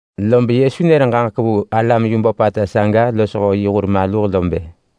Lob Yesu nër ġaġek vu alam yu böpata saga losho yi hur maluh lo bë,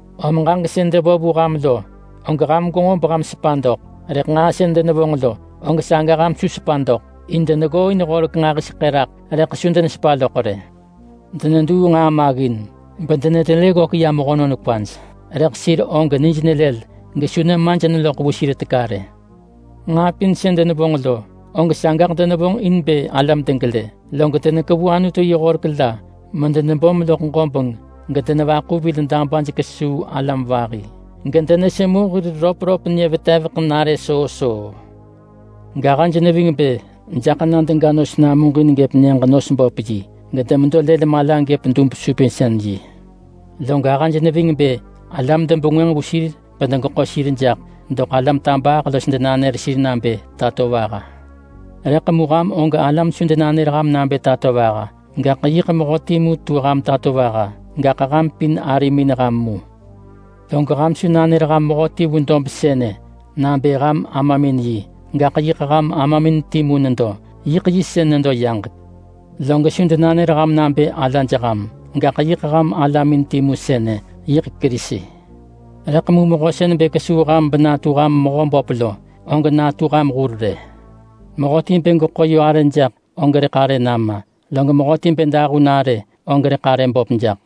om ġaġek sën devo vu ham lo, og ham gwenġo beham sepa doḳ. Rëḳ nġaa sën denevonġ lo, og saga ham su sepa doḳ. In deneggooin horek nġahiseḳë raḳ rëḳ su denevonġ yoh vu rë. Deneduu nġaa maggin bedenetelë raḳ ya mehönon kwaj, rëḳ sir og nij nelël gesu denevër nemaj in bë dedoḳ vu sir teka rë. Nġaa pin sën denevonġ lo, og sagaḳ denevonġ in bë alam degelë. Log denekevu Anutu yi horek la loḳ ḳapiya medebom loḳ ġobeng gedenevaḳu vil dabaj kesuu alam vahi gedenesemu hir röpröp nyë veteveḳ menare soo soo. Gahëj neving bë jaḳ na dega nos namuġin gëp nyëġ-nos-böp-yi, gedemedo lël mala gëp dub-supinsën-yi. Log ahëj neving bë alam debengwënġ vu sir bedegeḳo sir jaḳ doḳ alam tabaaḳ los denanër sir nabë Tatovaha. Rëḳ mu ham og alam su denanër ham nabë Tatovaha! Gaḳ yiḳ Mehö timu tu ham tatovaha, gaḳ ham pin arimin ham mu. Log ham su nanër ham mehöti vu dob sënë nabë ham Amamin yi. Gaḳ yiḳ ham Amamin timu nedo, yiḳ Yi sën nedo yaġek. Log su denanër ham nabë Alaj ham. Gaḳ yiḳ ham Alamin timu sënë, yiḳ Kerisi. Rëḳ mu mehö sën bë kesuu ham benatu ham mehö böp lo, og natu ham hur rë. Mehöti bë geḳo yö arë jaḳ, og rëḳ arë nama. Log mehöti bë dahun arë, og rëḳ arë böp jaḳ.”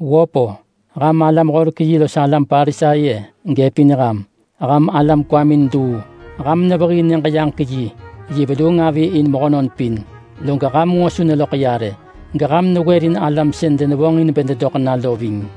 “Wöp-o! Ham alam-horek-yi los alam Parisai-e! Gëpin ham! Ham alam kwamin luu! Ham nevehii Nyëġ-yaġek-yi yi veluung avi in mehönon pin! Log ham nġo su neloḳ ya rë, geham newërin alam sën denevonġ in bë dedoḳ na lo ving.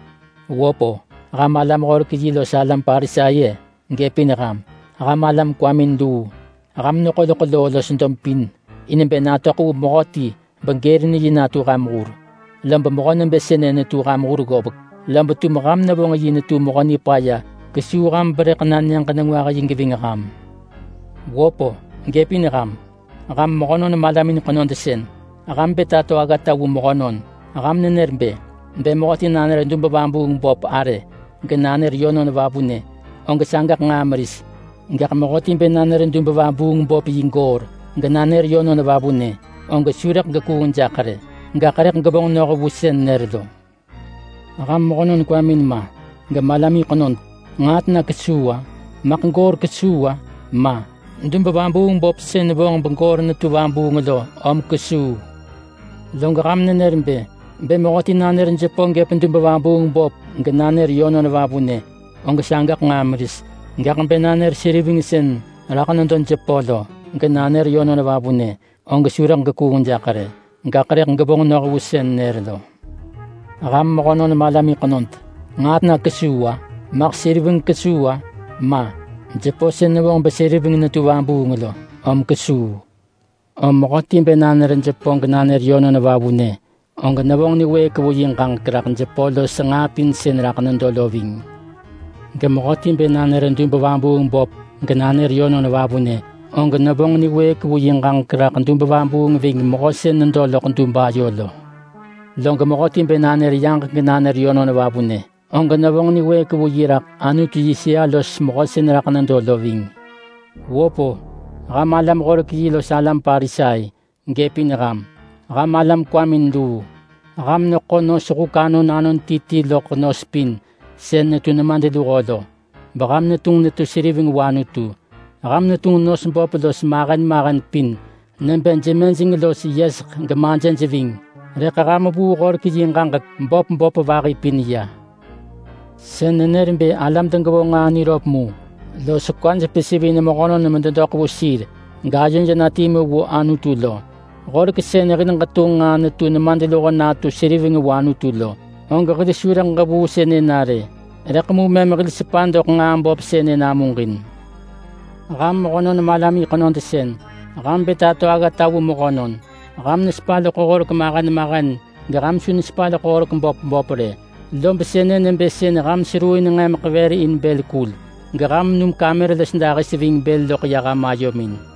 Wöp-o! Ham alam-horek-yi los alam Parisai-e! Gëpin ham! Ham alam kwamin luu! Ham neḳo loḳ loo los dob pin in bë natöḳ vu mehöti begërin yi natu ham hur. Lob mehö nebë sënë netu ham hur ggovek, lob tum ham nevonġ yi netu mehö nipaya kesuu ham berëḳ na Nyëġ-nengwah-yi geving ham.” “Wöp-o! Gëpin ham! Ham mehönon malamin ḳenod sën ham bë tato aggata vu mehönon! Ham nenër bë, ‘Bë mehöti nanër dub-vabuung-böp arë genanër yönon vavunë, og sagaḳ nġaa meris. Gaḳ mehöti bë nanër dub-vabuung-böp yi goor, genanër yönon vavunë, og su rëḳ gekuung jaḳ rë, gaḳ rëḳ gevonġ noh vu sën nër lo.’ Ham mehönon kwamin ma, gemalamin ḳenod! Nġaa tena kesuu-a? Maḳ goor kesuu-a? Ma! Dub-vabuung-böp sën vonġ begoor netu vabuung lo, om saga kesuu! Log ham nenër bë, ‘Bë mehöti nanër jepö gëp dub-vabuung-böp genanër yönon vavune, og sagaḳ nġaa meris. Gaḳ bë nanër seriveng sën raḳ nedo jepö lo, genanër yönon vavunë, og su rëḳ gekuung jaḳ rë, gaḳ rëḳ gevonġ noh vu sën nër lo.’ Ham mehönon malamin ḳenod! Nġaa tena kesuu-a? Maḳ seriveng kesuu-a? Ma! Jepö sën nevonġ beseriveng netu vabuung lo, om saga kesuu! Om mehöti bë nanër jepö genanër yönon vavunë, og nevonġ niwëëk vu yi ġaġek raḳ jepö los nġaa pin sën raḳ nedo lo ving. Gemehöti bë nanër dub-vabuung-böp genanër yönon vavunë, og nevonġ niwëëk vu yi ġaġek raḳ dub-vabuung ving Mehö sën nedo loḳ dub ayo lo. Log mehöti bë nanër yaġek genanër yönon vavunë, og nevonġ niwëëk vu yi raḳ Anutu yi sëa los Mehö sën raḳ nedo lo ving. Wöp-o! Ham alam-horek-yi los alam Parisai! Gëpin ham! Ham alam kwamin luu! Ham nos pin vu huk saga sën ham neḳo anon ti ti ggëp sën netu nemadluho lo, beham netunġ netu seriveng vu Anutu. Ham netunġ nos böp los mahen mahen pin nebë jemejeng los yeseḳ gemajëj ving, rëḳ ham vuu horek yi ġaġek böp böp vahi pin ya. Sën nenër bë alam degevonġ nġaa niröp mu, los kwaj pesivin mehönon mededoḳ vu sir gayoj na timu vu Anutu lo. Horek sën nebë hil abo nġaa sën netu nemadluho natu seriveng vu Anutu lo, og hil su rëḳ ġevuu sënë na rë. Rëḳ mu mëm hil sepa doḳ nġaa böp sënë namuġin. Ham mehönon malamin ḳenod sën ham bë tato aggata vu mehönon! Ham nesepa loḳ horek mahen mahen geham su nesepa loḳ horek böp böp rë, lob sënë nebë sën ham seruuin nġemeḳ vër in bël kul, geham num kamer los dahis ving bël loḳ ya ham ayomin.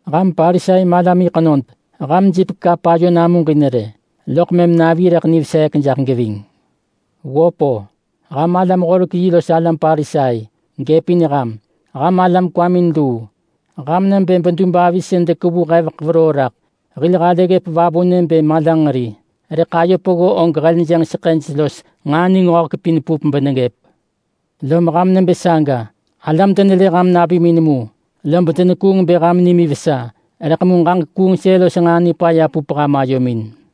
Ham Parisai malamin ḳenod! Ham jipek kap ayo namuġin rë, loḳ mëm navi rëḳ niveseek jaḳ geving. Wöp-o! Ham alam-horek-yi los alam Parisai, gëpin ham! Ham alam kwamin luu! Ham nebë bedub avi sën dekevu heveḳ veroo raḳ. Hil halë ggëp vavunë bë malanġeri, rëḳ ayo peggo og heljënġ seḳëj los nġaa ningöhek pin pup beneggëp. Lom ham nebë saga. Alam denelë ham navimin mu, lob denekuung bë ham nimin vesa. Rëḳ mu ġaġek kuungsën los nġaa nipaya pup ham ayomin.”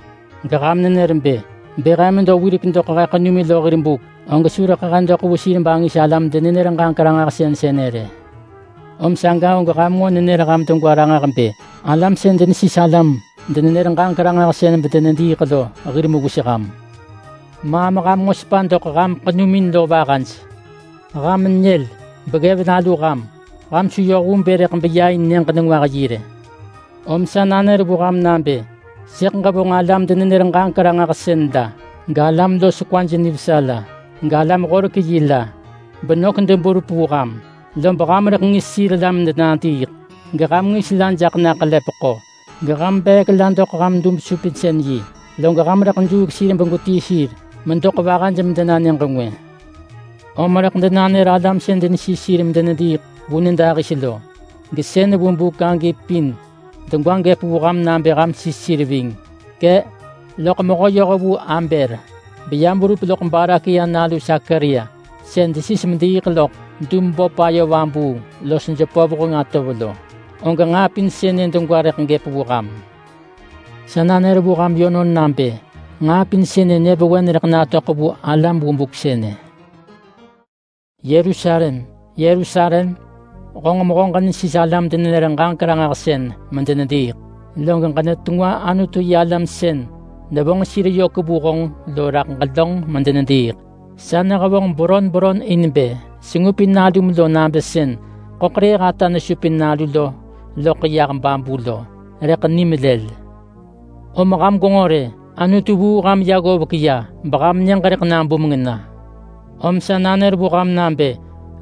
Geham nenër bë, ‘Bë he medo wirek doḳ he ḳenumin lo hir buk, og su rëḳ he doḳ vu sir bangis alam-denenër-ġaġek-ranġahsën sënë rë.’ Om saga og ham nġo nenër ham degwa ranġah bë alam sën denesis alam-denenër-ġaġek-ranġahsën bedenediiḳ lo hir mewis ham. Maam ham nġo tahu doḳ nah ham ḳenumin lo vahaj! Ham nyël! Beggëv nalu ham! Ham su yoh vu bë rëḳ beya in Nyëġ-nengwah-yi rë! Om sa nanër vu ham nabë sëḳ ġevonġ alam-denenër-ġaġek-ranġahsën la, galam los kwaj nivesa la, galam-horek-yi la, benök deberup vu ham, lob ham rëḳ ngis sir la medenadiiḳ, geham ngis la jaḳ na ḳelepeḳo, geham beek la doḳ ham dub-supinsën-yi. Log ham rëḳ juuk sir begwetii sir medoḳ vahaj medena nyëġ ngwë. Om rëḳ denanër alam sën denesis sir medenediiḳ vu nyëdahis lo, gesën vu buk agi pin degwa gëp vu ham nabë ham sis sir ving. Kë. Loḳ mehö-yohvu Abel, beyam verup loḳ Barakia nalu Sakaria sën desis mediiḳ loḳ dub-böp ayo vabuung los jepö vuheng atov lo, og nġaa pin sënë degwa rëḳ gëp vu ham. Sa nanër vu ham yönon nabë nġaa pin sënë nyëvewen rëḳ natöḳ vu alam vu buk sënë.” “Yerusalem, Yerusalem! Honġ mehö ġenesis alam-denenër-ġaġek-ranġahsën medenediiḳ, log ġenetengwa Anutu-yi-alam sën nevonġ sir yök vu honġ lo raḳ ġelönġ medenediiḳ! Sa nehevonġ beron beron in bë ngupin nalum lo nabë sën ḳöḳrëëh ata nesupin nalu lo loḳ yah babu lo, rëḳ nim lël. Om ham gwenġo rë! Anutu vuu ham ya ggovek ya beham nyëġ rëḳ nabumeng na. Om sa nanër vu ham nabë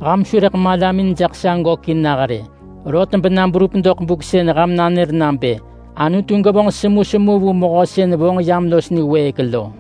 ham su rëḳ malamin jaḳ sa gökin nah rë, rot bena berup doḳ buk sën ham nanër nabë: ‘Anutu gevonġ semusemu vu Mehö sën vonġ yam los niwëëk lo!’”